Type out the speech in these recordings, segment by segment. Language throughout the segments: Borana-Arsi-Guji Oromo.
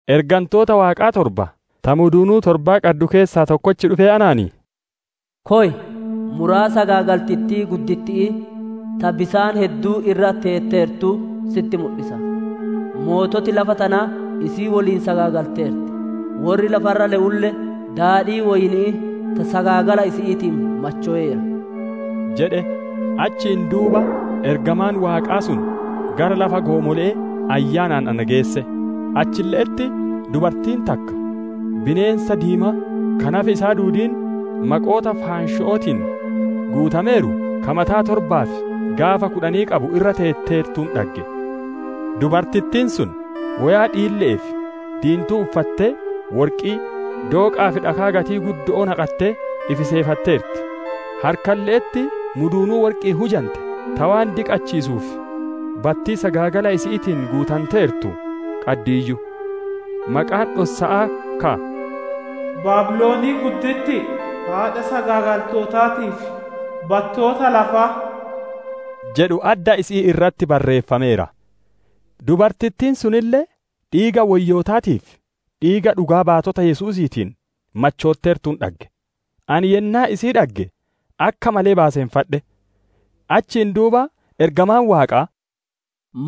Ergantoota Waaqaa torba ta muduunuu torba qaddu keessaa tokkochi dhufee anaan, «Koy, muraa sagaagaltittii gudditti'ii, ta bisaan hedduu irra teeteertuu sitti mudhisa. Moototi lafa tanaa isii woliin sagaagalteerti; worri lafa irra le'ulle daadhii woyni'ii ta sagaagala isi'iitiin machoweera» jedhe. Achiin duuba ergamaan Waaqaa sun gara lafa goomole'ee Ayyaanaan na geesse; achille'etti dubartiin takka, bineensa diimaa ka nafi isaa duudiin maqoota faansho'ootiin guutameeru, ka mataa torbaa fi gaafa kudhan qabu irra teeteertuun dhagge. Dubartittiin sun woyaa dhiille'ee fi diintuu uffattee, worqii, dooqaa fi dhakaa gatii guddo'oo naqattee, ifi seefatteerti; harkalle'etti muduunuu worqi'iin hujante, ta waan diqachiisuu fi battii sagaagala isi'iitiin guutanteertu qaddiiyyu. Maqaan dhossa'aa ka, «Baabilonii guddittii, haadha sagaagaltootaatii fi battoota lafaa» jedhu adda isi'ii irratti barreeffameera. Dubartittiin sunille, dhiiga woyyootaatii fi dhiiga dhugaa baatota Yesuusiitiin machootteertuun dhagge; ani yennaa isii dhagge akka malee baaseffadhe. Achiin duuba ergamaan Waaqaa,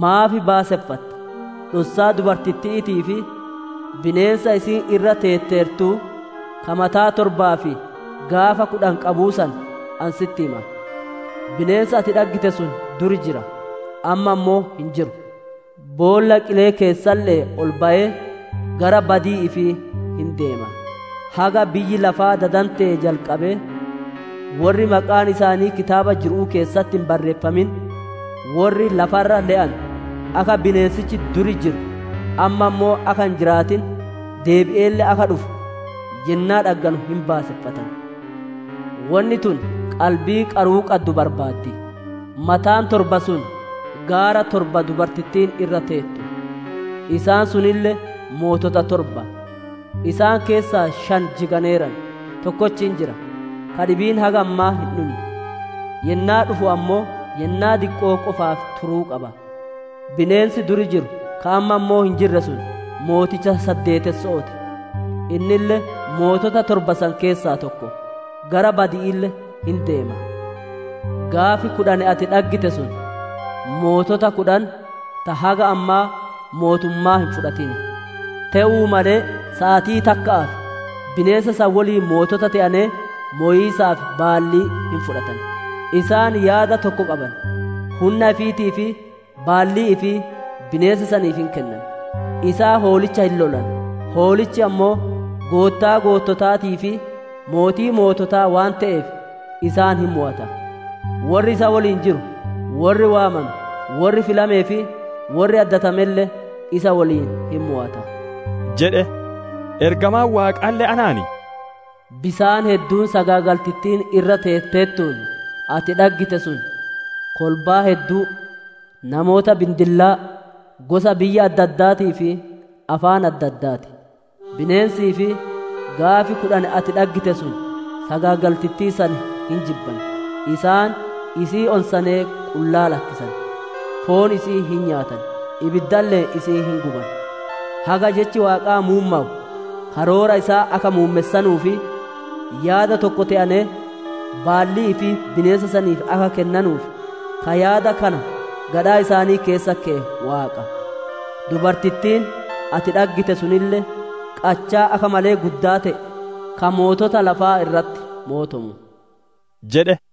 «Maaf baaseffatta? Dhossaa dubartitti'iitii fi bineensa isiin irra teetteertuu, ka mataa torbaa fi gaafa kudhan qabuu san, ani sitti hima. Bineensi ati dhaggite sun duri jira, amma ammoo hin jiru; boolla qilee keessalle'ee ol bayee, gara badii ifii hin deema. Haga biyyi lafaa dadantee jalqabee, worri maqaan isaanii kitaaba jiru'uu keessatti hin barreeffamin, worri lafa irra le'anu akka bineensichi duri jiru, amma ammoo akka hin jiraatin, deebi'eelle akka dhufu, yennaa dhagganu hin baaseffatan. «Wonni tun qalbii qaruu qaddu barbaaddi; mataan torba sun gaara torba dubartittiin irra teettu; isaan sunille mootota torba. Isaan keessaa shan jiganeeran; tokkochi hin jira, ka dhibiin haga ammaa hin dhunne; yennaa dhufu ammoo yennaa diqqoo qofaaf turuu qaba. Bineensi duri jiru, ka amma ammoo hin jirre sun, mooticha saddeetesso'oo ti; innille mootota torba san keessaa tokko; gara badi'iille hin deema. «Gaafi kudhan ati dhaggite sun, mootota kudhan ta haga ammaa mootummaa hin fudhatin; te'uu malee saatii takka'aaf, bineensa san woliin mootota te'anee mowiisaaf baallii hin fudhatan. Isaan yaada tokko qaban; hunna ifiitii fi baallii ifii bineensa saniif hin kennan. Isaan Hoolicha hin lolan; Hoolichi ammoo Goottaa goottotaatii fi mootii moototaa waan te'eef, isaan hin mowata. Worri isa woliin jiru, worri waamame, worri filamee fi worri addatamelle isa woliin hin mowata» jedhe. Ergamaan Waaqaalle anaan, «Bisaan hedduun sagaagaltittiin irra teetteertuun ati dhaggite sun kolbaa hedduu, namoota bindillaa, gosa biyya adda addaatii fi afaan adda addaa ti. Bineensii fi gaafi kudhan ati dhaggite sun sagaagaltittii san hin jibban; isaan isii onsanee qullaa lakkisan; foon isi'ii hin nyaatan, ibiddalle'een isii hin guban. Haga Jechi Waaqaa muummowu, karoora isaa akka muummessanuu fi yaada tokko te'anee baallii ifii bineensa saniif akka kennanuuf, ka yaada kana gadhaa isaanii keessa keye Waaqa. Dubartittiin ati dhaggite sunille, qachaa akka malee guddaa te'e ka mootota lafaa irratti mootomu» jedhe.